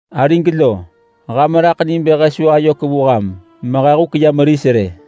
Arig lo! Ham raḳ ni bë he su ayök vu ham mehe huk ya meris rë.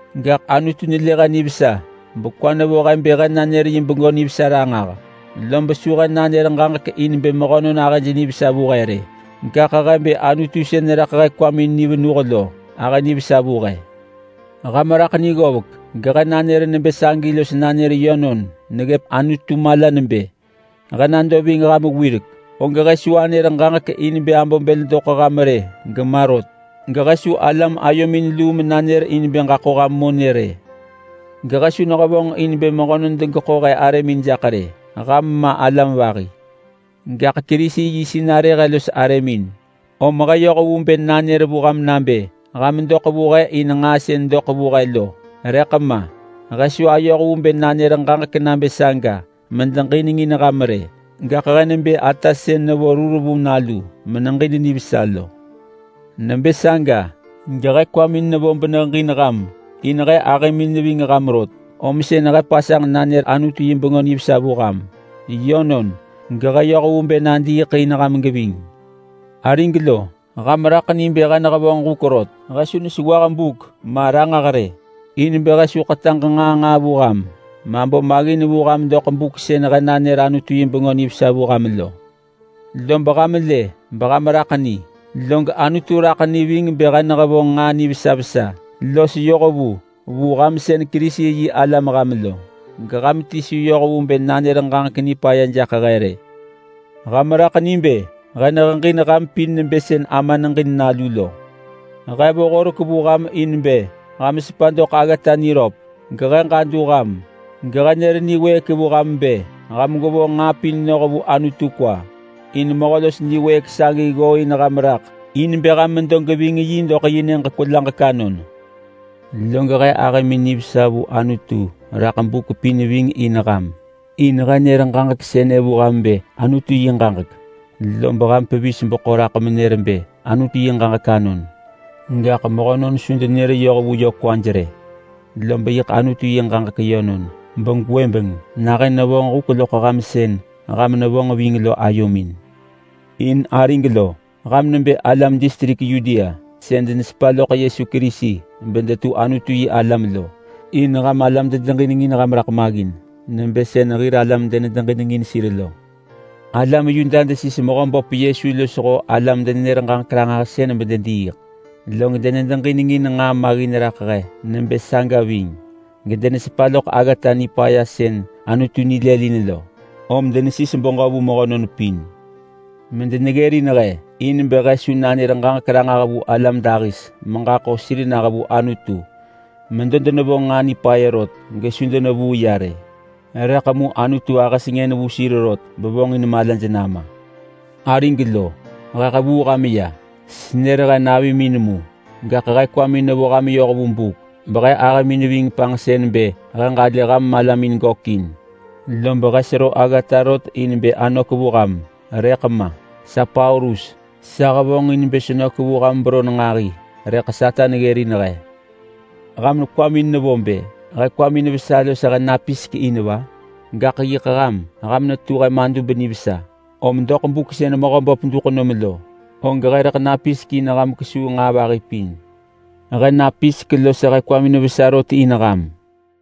Gaḳ Anutu nelë he nivesa bekwa vo he bë he nanër yi Bengö Nivesa ranġah. Lob su he nanër ġaġek in bë mehönon ahëj nivesa vu he rë, gaḳ he bë Anutu sën neraḳ he kwamin ni venuh lo ahë nivesa vu he. Ham raḳ ni ggovek, gehe nanër nebë sagi los nanër yönon neggëp Anutu mala nebë: He nado ving ham wirek, og he su anër ġaġek in bë abo bël doḳ ham rë gema rot, gehe su alam ayomin luu manër in bë ġaḳo ham monë rë. Gehe su nehevonġ in bë mehönon degeḳo he arëmin jaḳ rë. Ham ma alam vahi. Gaḳ Kerisi yi sinarë he los arëmin, om he yoh vu bë nanër vu ham nabë ham doḳ vu he in nġaa sën doḳ vu he rëḳ ma. He su ayoh vu bë nanër ġaġek nabë saga medeġinengin ham rë. Gaḳ he nebë ata sën neġin nalu nivesa menevet sir lo. Nebë saga, gehe kwamin nevo ham beneheġin ham in he ahëmin neving ham rot, om sën he pasanġ nanër Anutu yi Bengö Nivesa vu ham. Yönon, gehe yoh vu bë nadiiḳ in ham geving. Arig lo, ham kwamin bo nabë he nehevonġ huk rot. He su nesewah buk ma ranġah rë, in bë he su ḳetaġ nġaa nġaa vu ham mabo maggin vu ham doḳ buk sën he nanër Anutu yi Bengö Nivesa vu ham lo. Lob ham lë beham raḳ ni, log Anutu raḳ ni ving bë he nehevonġ nġaa nivesa vesa los yohvu vu ham sën Kerisi-yi-alam ham lo, geham ti su yoh vu bë nanër ġaġek nipaya jaḳ he rë. Ham raḳ ni bë he neheġin ham pin nebë sën ama neġin nalu lo. He vo horek vu ham in bë ham sepa doḳ aggata niröp. Gehe ġadu ham, gehe nër niwëëk vu ham bë ham gwevonġ nġaa pin noh vu Anutu kwa. In Mehö los niwëëk sagi ggooin ham raḳ in bë ham medo geving yi doḳ yi nyëġ niḳapiik. Log he ahëmin nivesa vu Anutu raḳ buk pin ving in ham, in he nër ġaġek sënë vu ham bë Anutu yi ġaġek, lob ham pevis beḳo raḳ menër bë Anutu yi ġaġek anon gaḳ mehönon su denër yoh vu yö kwaj rë. Lob yiḳ Anutu yi ġaġek yönon, begwëbeng nahën nevonġ huk loḳ ham sën ham nevonġ ving lo ayomin. In arig lo, ham nebë alam distrik Yudea sën denesepa loḳ Yesu Kerisi bedetu Anutu-yi-alam lo, in ham alam dedeġinengin ham raḳ maggin nebë sën hir alam denedeġinengin sir lo. Alam Yuda desis Mehöböp Yesu losho alam-denenër-ġaġek-ranġahsën bedediiḳ, log denede-ġinengin nġaa maggin raḳ he nebë saga ving gedenesepa loḳ aggata nipaya sën Anutu nilëlin lo. Om denesis beġö vu mehönon pin medeneggërin he in bë he su nanër ġaġek ranġah vu alam dahis meġaḳo sir nah vu Anutu. Medo denevonġ nġaa nipaya rot gesu denevuu ya rë, rëḳ mu Anutu ahë sengën vu sir rot bevonġin malaj nama. Arig lo, he hevuu ham ya. Senër he navimin mu, gaḳ he kwamin nevo ham yoh vu buk behe ahëmin ving panġsën bë he ġalë ham malamin gökin, lob he sero aggata rot in bë anök vu ham rëḳ ma. Sa Paulus, sa hevonġin bë senök vu ham beron nġahi rëḳ Satan ggërin he. Ham kwamin nevo bë he kwamin vesa los he napisek in va? Gaḳ yiḳ ham! Ham netu he madub nivesa, om doḳ buk sën Mehöböp duḳ nom lo, og he rëḳ napisek in ham kesuu nġaa vahi pin. He napisek los he kwamin vesa rot in ham.